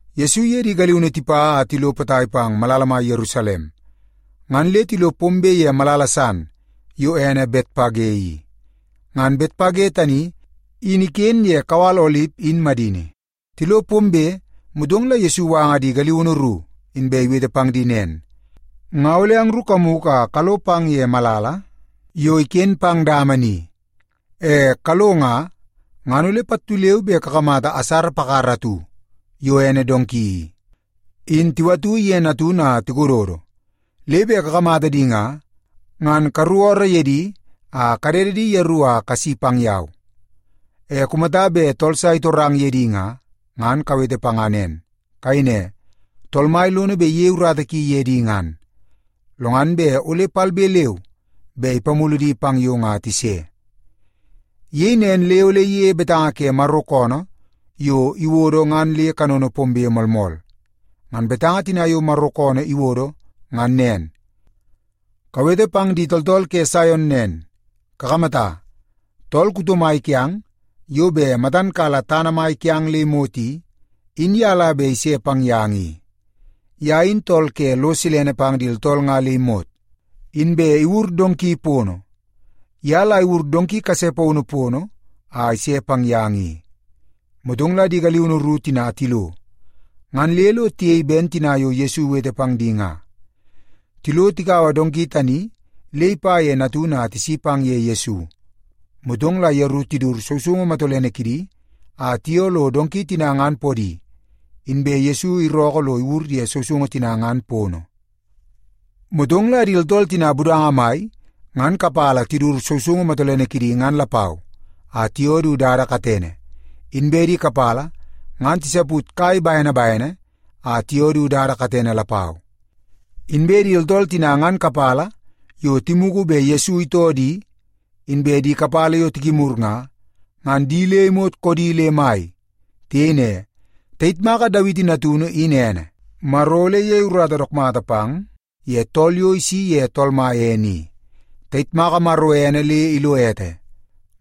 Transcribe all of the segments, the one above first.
Yesu iye di galiunu tipa a tilo potai pang malala mai Yerusalem, ngan le tilo pombe ye malala san yo ene Betpage i. Ngan Betpage tani in iken ye kawal Olip in madini. Tilo pombe, motong la Yesu iwanga di galiunu ru, inbe iwete pang di nen, “Nga ole angru kamugu a kalo pang ye malala yo iken pang dama ni. E kalo nga, ngan ole pattu leu be kakamata asara pakara atu yo ene donki i, in tiwatu iye natunu a tikododo. Le bet kakamata di nga, ngan karuku ooroo ye di a kadede di yeru a kasi pang yau. E kumata bet tool sa itorang ye di nga, ngan kawete panga nen. Kayei ne, ‘Tool Mai lono bet iyei urata ki ye di ngan, lo ngan bet ole palbe leu be ipamulu di pang yong a tise.’” Iyei nen le ole iyeie betanga ke Maro koonoo yo iwodo nga le kanono pombe moolmool. Ngan betanga tina yo Maro koonoo iwodo ngan nen, “Kawete pang di tooltool ke Saion nen, ‘Kakamata, tool kuto mai kiang yo bet matan kala tana mai kiang le imot i, in ye la bet ise pang yang i. Ye in tool ke lo silene pang di tooltool nga le imot, inbe iwur donki pono. Ye la iwur donki kase paunu pono a ise pang yang i.’” Motong la di galiunu ru tina tilo, ngan le lo tiyei ben tina yo Yesu iwete pang di nga. Tilo tikaua donki tani le ipa ye natunu a tisi pang ye Yesu. Motong la yeru tidut sousoungu matolene kidi a tiyoo lo donki tina ngan podi, inbe Yesu irookoo lo iwur ye sousoungu tina ngan pono. Motong la di tooltool tina budanga mai ngan kapala tidut sousoungu matolene kidi ngan lapau, a tiyoo du dada katene, inbe di kapala ngan tisaput kai bene bene a tiyoo du dada katene lapau. Inbe di tooltool tina ngan kapala yo timugu bet Yesu itoo di, inbe di kapala yo tikimur nga, ngan di le imot koodi le mai. Tiyei ne, “Tayitmaka Dawiti natunu in ene! Maro ole iyei urata dook mata pang ye tool yo isi ye Tool Mai ene i! Tayitmaka Maro ene le ilo ete!”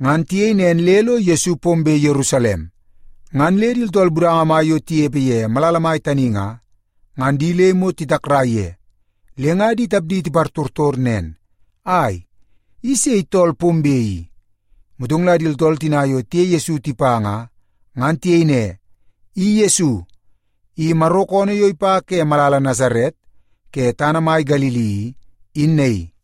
Ngan tiyei nen le lo Yesu pombe Yerusalem, ngan le di tooltool budanga mai yo tinepe ye malala mai tani nga, ngan di le imot titakrai ye, le nga di tapdi tipartortor nen, “Ai, i sei tool pombe i?” Motong la di tooltool tina yo tiye Yesu tipa nga, ngan tiyei ne, “I Yesu! I Maro koonoo yo ipa ke malala Nasaret ke tana mai Galili i, in naii.”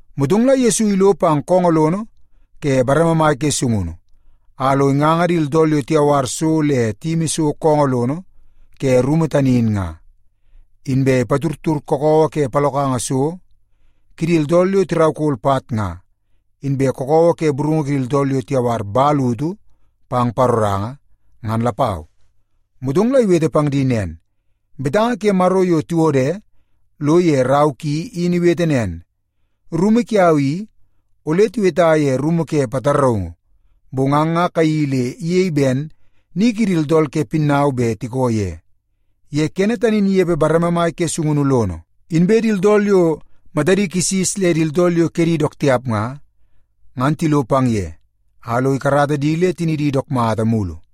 Motong la Yesu ilo pang koongoo lono ke bareme mai ke sungunu, a lo inganga di tooltool yo tiyawar so le tiyimimi so koongoo lono ke rumu tani in nga. Inbe ipatudtud kakawa ke palokanga so kidi tooltool yo tiraukol pat nga, inbe kakawa ke burungu kidi tooltool yo tiyawar man utu pang paroranga, ngan lapau. Motong la iwete pang di nen, “Betanga ke Maro yo tiwode lo ye rau ki in iwete nen. ‘Rumu kiau i, ole tiweta ye rumu ke pataraungu.’ Bong ang nga kayeii le iyei ben ‘ni kidi tooltool ke pinnau bet tiko ye.’” Ye kene tani in inepe bareme mai ke sungunu lono, inbe di tooltool yo matadi kisis le di tooltool yo kedi dook tiap nga, ngan tilo pang ye, a lo ikarata di le tinidi dook mata mulu.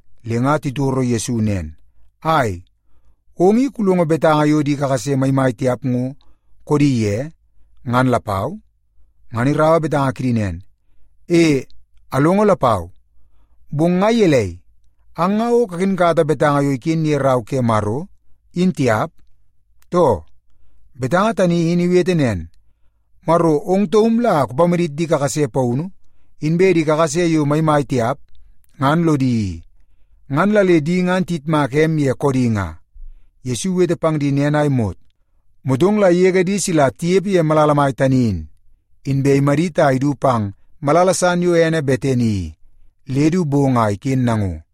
Le nga titoro Yesu nen, “Ai, ong i kulongo betanga yo di kakase maimai tiap ngo koodi ye ngan lapau?” Ngan iraua betanga kidi nen, “E, alongo lapau. Bong nga gelei, ang nga o kakinkata betanga yo iken ye Rau ke Maro, in tiap, too? Betanga tani in iwete nen, ‘Maro ong taum la kupamadit di kakase paunu inbe di kakase yo maimai tiap ngan lodi i, ngan la le di nga tiyitmaka em ye koodi nga.’” Yesu iwete pang di nen a imot, motong la igege di sila tinepe ye malala mai tani in, inbe imadit a idu pang malala san yo ene Betani i, le du bong a iken nango.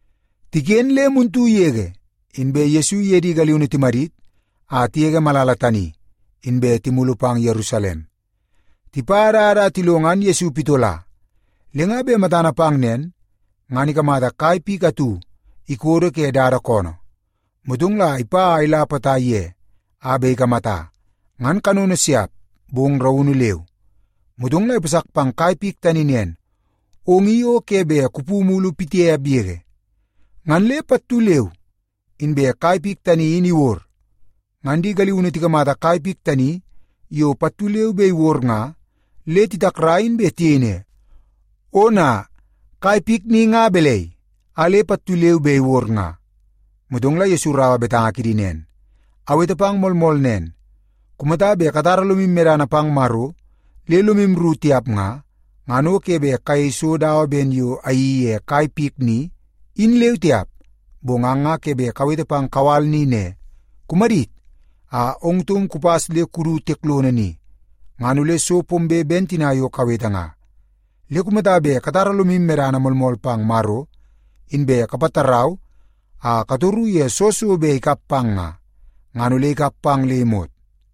Tiken le muntu yege, inbe Yesu iye di galiunu timadit a tigege malala tani, inbe timulu pang Yerusalem. Tipa dada a tilo ngan Yesu pitola. Le nga bet matana pang nen, ngan ikamata kai pik atu ikodo ke dada koonoo. Motong la ipa a ila potai ye a bet ikamata, ngan kanono siap, bong raunu leu. Motong la ipasak pang kai pik tani nen, “Ong i o ke bet kupu mulu pitiap yege.” Ngan le pattu leu inbe kai pik tani in iwod. Ngan di galiunu tikamata kai pik tani yo pattu leu be iwod nga, le titakrai, inbe tiyei ne, “Ona, kai pik ni nga balai a le pattu leu be iwod nga?” Motong la Yesu iraua betanga kidi nen, “Awete pang moolmool nen. Kumata bet katara lomu medana pang Maro le lomu rru tiap nga, ngan o ke bet kayei so dawa ben yo ayeii ye kai pik ni, in leu tiap. Bong ang nga ke bet kawete pang kawal ni ne, ‘Kumadit a ong taum kupas le kudu tiek lono ni,’ ngan ole so pombe ben tina yo kawete nga. Le kumata bet katara lomu medana moolmool pang Maro, inbe kapatarau a katoru ye soo so bet ikap pang nga, ngan ole ikap pang le imot.”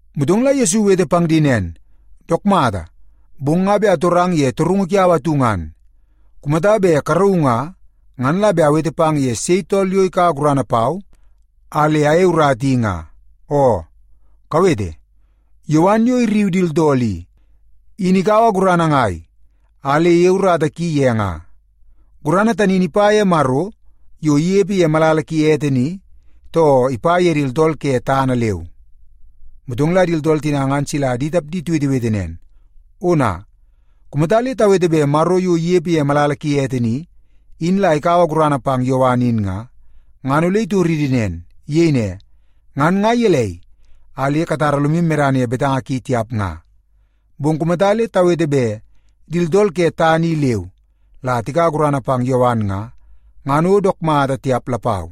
Motong la Yesu iwete pang di nen, “Dook mata, bong nga bet atorang ye torungu kiau atu ngan. Kumata bet karauu nga, ngan la bet awete pang ye sei tool yo ikaua gurana pau a le ayei urata i nga. Oo, kawete! Yowan yo irriu di tooltool i, in ikaua gurana ngai a le iyei urata ki ye nga? Gurana tani in ipa ye Maro yo inepe ye malala ki ete ni, too ipa ye di tooltool ke tana leu?” Motong la di tooltool tina ngan sila di tapdi tiwetewete nen, “Ona! Kumata le tawete bet Maro yo inepe ye malala ki ete ni, in la ikaua gurana pang Yowan in nga, ngan ole itoridi nen. Iyei ne, ‘Ngan nga gelei a le katara lomu medana ye betanga ki tiap nga?’ Bong kumata le tawete bet di tooltool ke tana i leu la tikaua gurana pang Yowan nga, ngan o dook mata tiap lapau.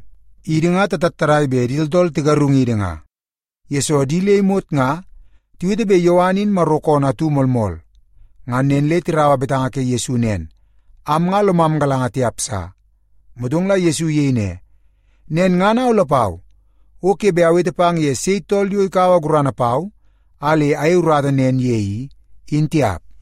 Idi nga tatattadai bet di tooltool tigarungidi nga, yesoo di le imot nga tiwete bet Yowan in Maro koonoo atu moolmool.” Ngan nen le tiraua betanga ke Yesu nen, “Am nga lomam galanga tiap sa.” Motong la Yesu iyei ne, “Nen ngan au lapau, o ke bet awete pang ye sei tool yo ikaua gurana pau a le ayei urata nen ye i, in tiap.”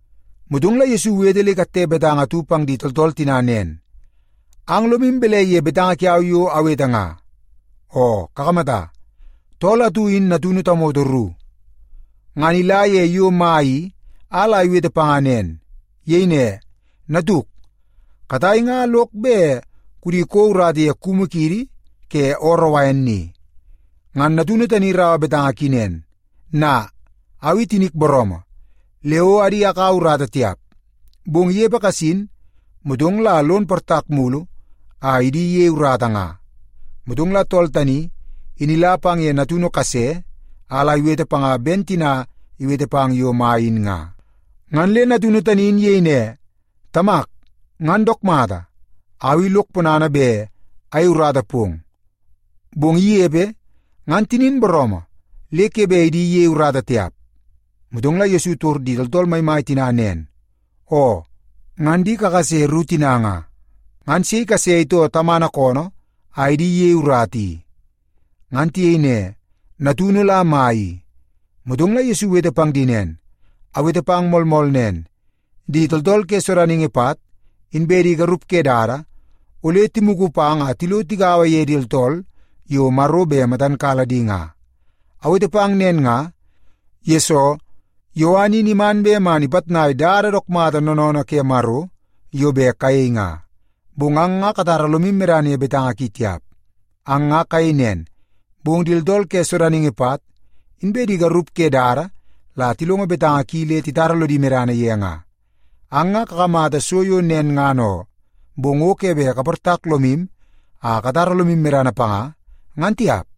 Motong la Yesu iwete le ikatte betanga atu pang di tooltool tina nen, “Ang lomu balai ye betanga kiau yo awete nga? Oo kakamata, tool atu in natunu tamoto ru. Ngan ila ye yo mai i a la iwete panga nen. Iyei ne, ‘Natuk, katai nga lok bet kudi kouo urata ye kumu kiidi ke ooroo wain ni.’ “Ngan natunu tani iraua betanga ki nen, ‘Na, au i tinik booroomoo, le o adi akaua urata tiap.’ Bong inepe kasin, motong la lon portak mulu a idi iyei urata nga. “Motong la tool tani, in ila pang ye natunu kase a la iwete panga ben tina iwete pang yo mai in nga. Ngan le natunu tani in iyei ne, ‘Tamak, ngan dook mata. Au i lok ponana bet ayei urata pong.’ Bong inepe, ngan tinin booroomoo le ke bet idi iyei urata tiap.” Motong la Yesu itor di tooltool maimai tina nen, “Oo, ngan di kakase ru tina nga, ngan sei kase itoo tamana koonoo a idi iyei urata i?” Ngan tiyei ne, “Natunu la mai i.” Motong la Yesu iwete pang di nen, “Awete pang moolmool nen, di tooltool ke sodaningi pat, inbe di garup ke dada, ole timugu pang a tilo tigaua ye di tooltool yo Maro bet matan kala di nga. Awete pang nen nga, yesoo Yowan in iman bet man ipitnai dada dook mata noonoonoo ke Maro yo bet kayei nga, bong ang nga katara lomu medana ye betanga ki tiap. Ang nga kayei nen, bong di tooltool ke sodaningi pat, inbe di garup ke dada la tilongo betanga ki le titara lodi medana ye nga. Ang nga kakamata so yo nen ngan oo, bong o ke bet kaportak lomu a katara lomu medana panga, ngan tiap.”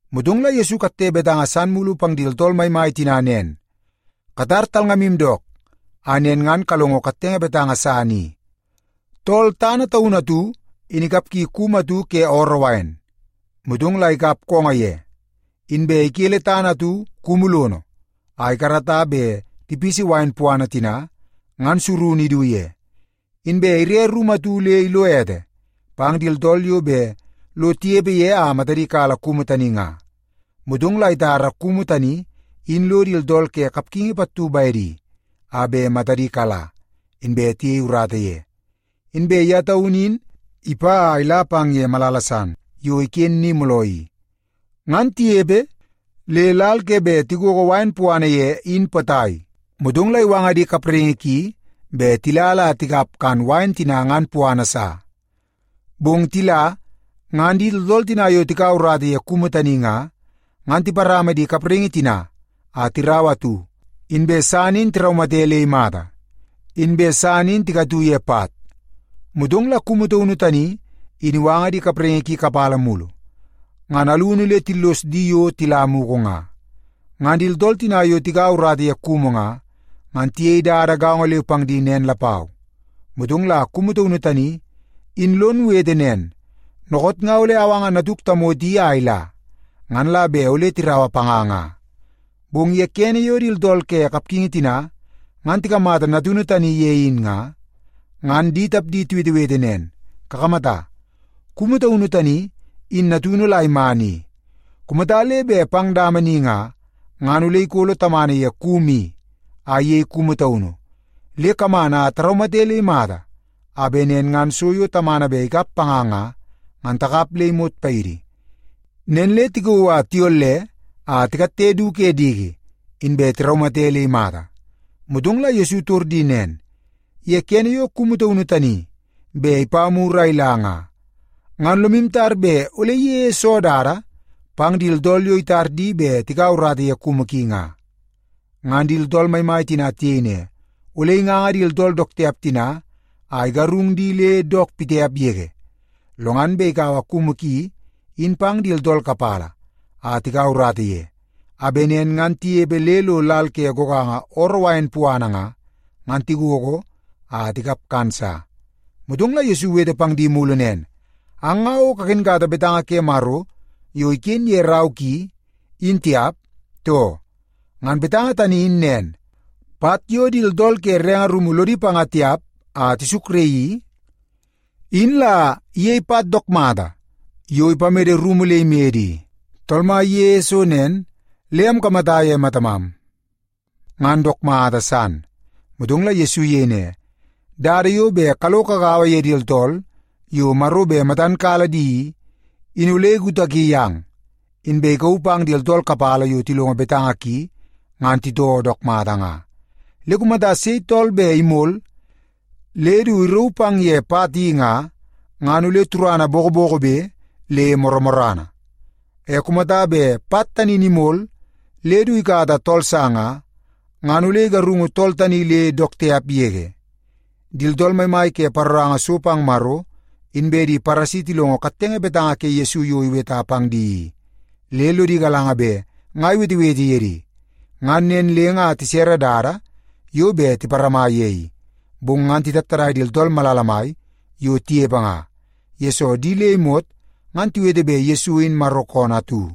Motong la Yesu ikatte betanga san mulu pang di tooltool maimai tina nen, “Katar talngamu dook, a nen ngan kalongo kattenge betanga san i. Tool tana taunu atu in ikapgi kumu atu ke ooroo wain, motong la ikap koongoo ye. Inbe ikele tana atu kumu lono a ikarata bet tipisi wain puana tina ngan surunu idu ye. Inbe ire rumu atu le ilo ete pang di tooltool yo bet lo tinepe ye a matadi kala kumu tani nga. Motong la itara kumu tani in lo di tooltool ke kapgingi pattu bedi, a bet matadi kala, inbe tiyei urata ye. Inbe ye taunu in ipa a ila pang ye malala san yo iken ni mooloo i. Ngan tinepe le lal ke bet tigogo wain puana ye in potai, motong la iwanga di kapraingi ki bet tila la tikap kan wain tina ngan puana sa. “Bong tila, ngan di tooltool tina yo tikaua urata ye kumu tani nga, ngan tiparama di kapraingi tina a tiraua atu, inbe san in tiraumate le imata, inbe san in tikatu ye pat. Motong la kumu taunu tani in iwanga di kapraingi ki kapala mulu, ngan alunu le tillos di yo tila mugu nga. Ngan di tooltool tina yo tikaua urata ye kumu nga, ngan tiyei dada gaongo leu pang di nen lapau. Motong la kumu taunu tani, in lon wete nen, ‘Dookoot nga ole awanga natuk tamoto i a ila, ngan la bet ole tiraua panga nga.’ “Bong ye kene yo di tooltool ke kapgingi tina ngan tikamata natunu tani ye in nga, ngan di tapdi tiwetewete nen, ‘Kakamata, kumu taunu tani in natunu la iman i. Kumata le bet pang dama ni nga, ngan ole ikolo tamana ye kumu i a iyei kumu taunu. Le kaman a taraumate le imata, a bet nen ngan so yo tamana bet ikap panga nga, ngan takap le imot paidi.’ Nen le tikauu a tiyolle a tikatte du ke diki, inbe tiraumate le imata.” Motong la Yesu itor di nen, “Ye kene yo kumu taunu tani bet ipa mur a ila nga, ngan lomu tar bet ole iyeie soo dada pang di tooltool yo itar di bet tikaua urata ye kumu ki nga?” Ngan di tooltool maimai tina tiyei ne, “Ole inganga di tooltool dook tiap tina a igarung di le dook tiap yege. Lo ngan bet ikaua kumu ki in pang di tooltool kapala a tikaua urata ye, a bet nen ngan tinepe le lo lal ke goganga ooroo wain puana nga, ngan tigogo a tikap kan sa.” Motong la Yesu iwete pang di mulu nen, “Ang nga o kakinkata betanga ke Maro yo iken ye rau ki, in tiap, too? Ngan betanga tani in nen, ‘Pat yo di tooltool ke renge rumu lodi panga tiap a tisukraii i, in la iyei pat dook mata yo bet ipamede rumu le imede i. Tool Mai iyeie so nen, le amkamata ye matamam, ngan dook mata san.’” Motong la Yesu iyei ne, “Dada yo bet kalo kagaua ye di tooltool yo Maro bet matan kala di i, in ole ikutaki yang, inbe ikauu pang di tooltool kapala yo tilongo betanga ki ngan titoo dook mata nga. Le kumata sei tool bet imol le du irauu pang ye pat tani nga, ngan ole turana bokobokobe le morrana. E kumata bet pat tani in imol le du ikata tool sa nga, ngan ole igarungu tool tani le dook tiap yege.” Di tooltool maimai ke paroranga so pang Maro, inbe di Paresi tilongo kattenge betanga ke Yesu yo iweta pang di i, le lodi galanga bet nga iwetewete ye di. Ngan nen le nga tisere dada yo bet tiparama ye i, bong ngan titattadai di tooltool malala mai yo tinepe nga, yesoo di le imot ngan tiwete bet Yesu in Maro koonoo atu.